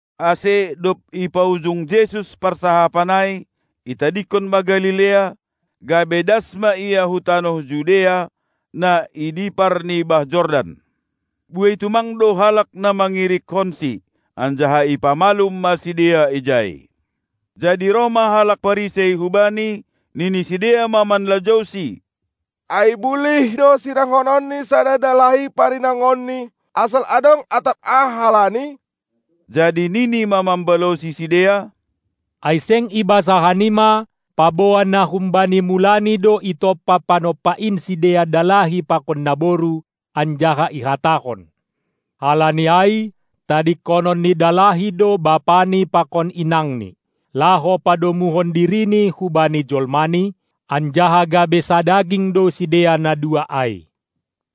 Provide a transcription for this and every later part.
Ase dob ipaujung Jesus parsahapan ai, itadingkon ma Galilea, gabe das ma Ia hu tanoh Judea, na i dipar ni bah Jordan. Buei tumang do halak na mangirikkonSi, anjaha ipamalum ma sidea ijai. Jadi roh ma halak Parisei hu Bani, nini sidea ma manlajouSi: Ai bulih do sirangkonon ni sada dalahi parinangonni, asal adong atap aha halani? Jadi nini ma mambalosi sidea: Ai seng ibasa hanima, paboa na humbani mulani do itompa Panompa in sidea dalahi pakon naboru, anjaha ihatahon: Halani ai tadingkonon ni dalahi do bapani pakon inangni, laho padomuhon dirini hubani jolmani, anjaha gabe sadaging do sidea na dua ai?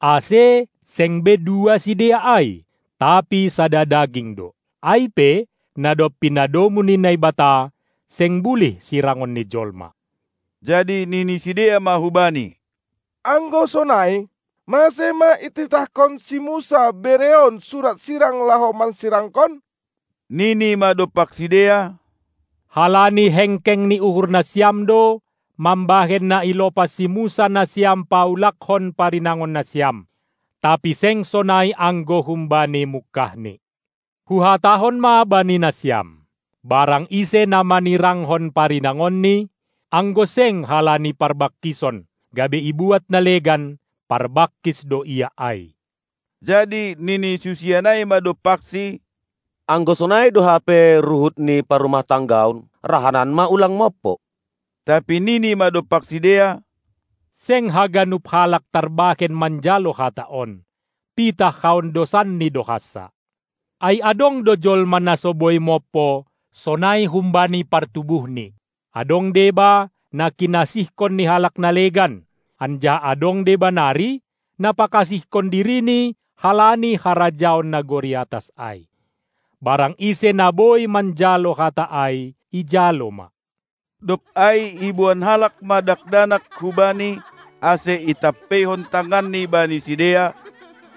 Ase seng be dua sidea ai, tapi sada daging do. Ai pe, na dob pinadomu ni Naibata, seng bulih sirangon ni jolma. Jadi nini sidea ma hu Bani: Anggo sonai, mase ma ititahkon si Musa bereon surat sirang laho mansirangkon? Nini ma dompak sidea: Halani hengkeng ni uhur nasiam do, mambahen na ilopas si Musa nasiam paulakkon parinangon nasiam; tapi seng sonai anggo humbani mungkahni. Huhatahon ma bani nasiam: Barang ise na manirangkon parinangonni, anggo seng halani parbangkison, gabe ibuat na legan, parbangkis do ia ai. Jadi nini susian ai ma dompakSi: Anggo sonai do hape ruhut ni parrumah-tanggaon, rahanan ma ulang mompo. Tapi nini ma dompak sidea: Seng haganup halak tarbahen manjalo hata on, pitah haondosanni do hansa. Ai adong do jolma na so boi mompo, sonai humbani partubuhni; adong deba, na kinasihkon ni halak na legan, anjaha adong deba nari, na pakasihkon dirini halani harajaon nagori atas ai. Barang ise na boi manjalo hata ai, ijalo ma! Dob ai iboan halak ma dakdanak hu Bani, ase itampeihon tanganNi bani sidea,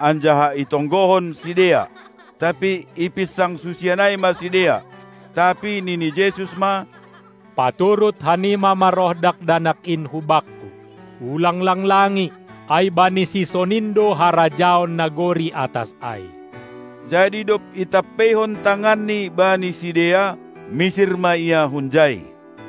anjaha itonggohon sidea. Tapi ipinsang susian ai ma sidea. Tapi nini Jesus ma: Paturut hanima ma roh dakdanak in hu Bakku, ulang langlangi, ai bani sisonin do harajaon nagori atas ai. Jadi dob itampeihon tanganNi bani sidea, misir ma Ia hunjai.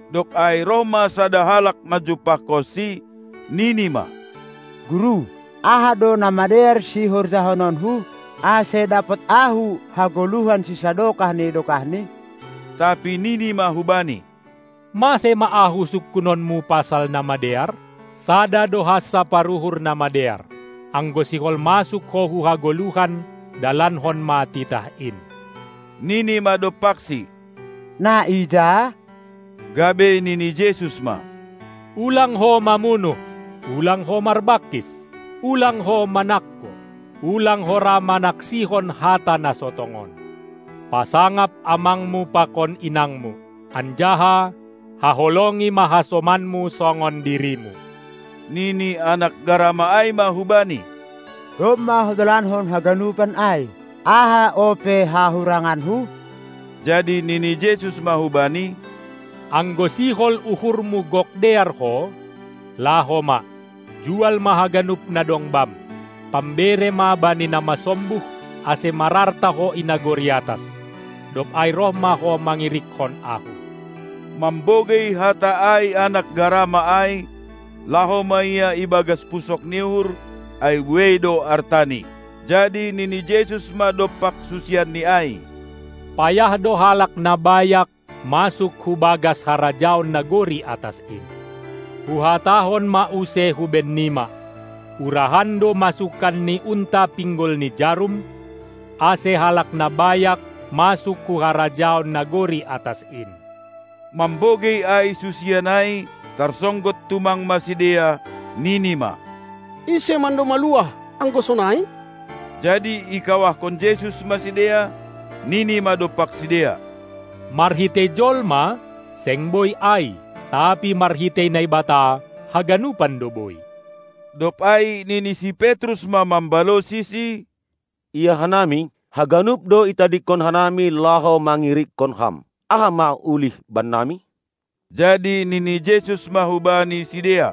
Dob ai roh ma sada halak manjumpahkonSi, nini ma: Guru, aha do na madear sihorjahononku, ase dapot ahu hagoluhan sisadokah ni dokahni? Tapi nini ma hubani: Mase ma Ahu sungkunonmu pasal na madear? Sada do hansa paruhur na madear. Anggo sihol masuk ho hu hagoluhan, dalankon ma titah in! Nini ma dompakSi: Na ija? Gabe nini Jesus ma: Ulang ho mamunuh! Ulang ho marbangkis! Ulang ho manangko! Ulang ho ra manaksihon hata na so tongon! Pasangap amangmu pakon inangmu! Anjaha: Haholongi ma hasomanmu songon dirimu! Nini anak garama ai ma hu Bani: Domma hudalankon haganupan ai. Aha ope hahuranganku? Jadi nini Jesus ma hubani: Anggo sihol uhurmu gok dear ho, laho ma, jual ma haganup na dong bam, pambere ma bani na masombuh, ase mararta ho i nagori atas. Dob ai roh ma ho mangirikkon Ahu! Mambogei hata ai anak garama ai, laho ma ia ibagas pusok ni uhur, ai buei do artani. Jadi nini Jesus ma dompak susianNi ai: Payah do halak na bayak masuk hu bagas harajaon nagori atas in. Huhatahon ma use hubennima: Urahan do masukan ni unta pinggol ni jarum, ase halak na bayak masuk hu harajaon nagori atas in. Mambogei ai susian ai, tarsonggot tumang ma sidea, nini ma: Ise mando maluah, anggo sonai? Jadi ikawahkon Jesus ma sidea, nini ma dompak sidea: Marhitei jolma, seng boi ai, tapi marhitei Naibata haganupan do boi. Dob ai nini si Petrus ma mambalosiSi: Ia hanami, haganup do itadingkon hanami laho mangirikkon Ham, Aha ma ulih bannami? Jadi nini Jesus ma hubani sidea: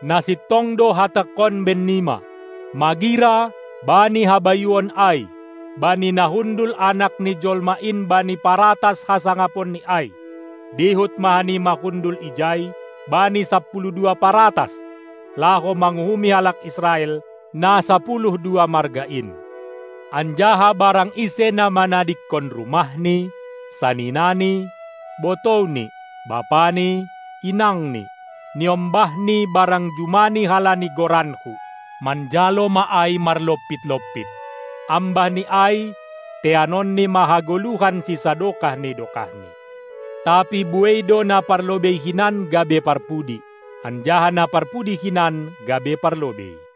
Na sintong do Hatangkon bennima: Magira, bani habayuon ai, bani na hundul Anak ni Jolma in bani paratas hasangaponNi ai, dihut ma hanima hundul ijai bani sapuluh dua paratas, laho manguhumi halak Israel, na sapuluh dua marga in. Anjaha barang ise na manadingkon rumahni, saninani, botouni, bapani, inangni, niombahni barang jumani halani goranKu, manjalo ma ai marlompit-lompit, ambahni ai teanonni ma hagoluhan sisadokah ni dokahni. Tapi buei do na parlobei hinan gabe parpudi, anjaha na parpudi hinan gabe parlobei.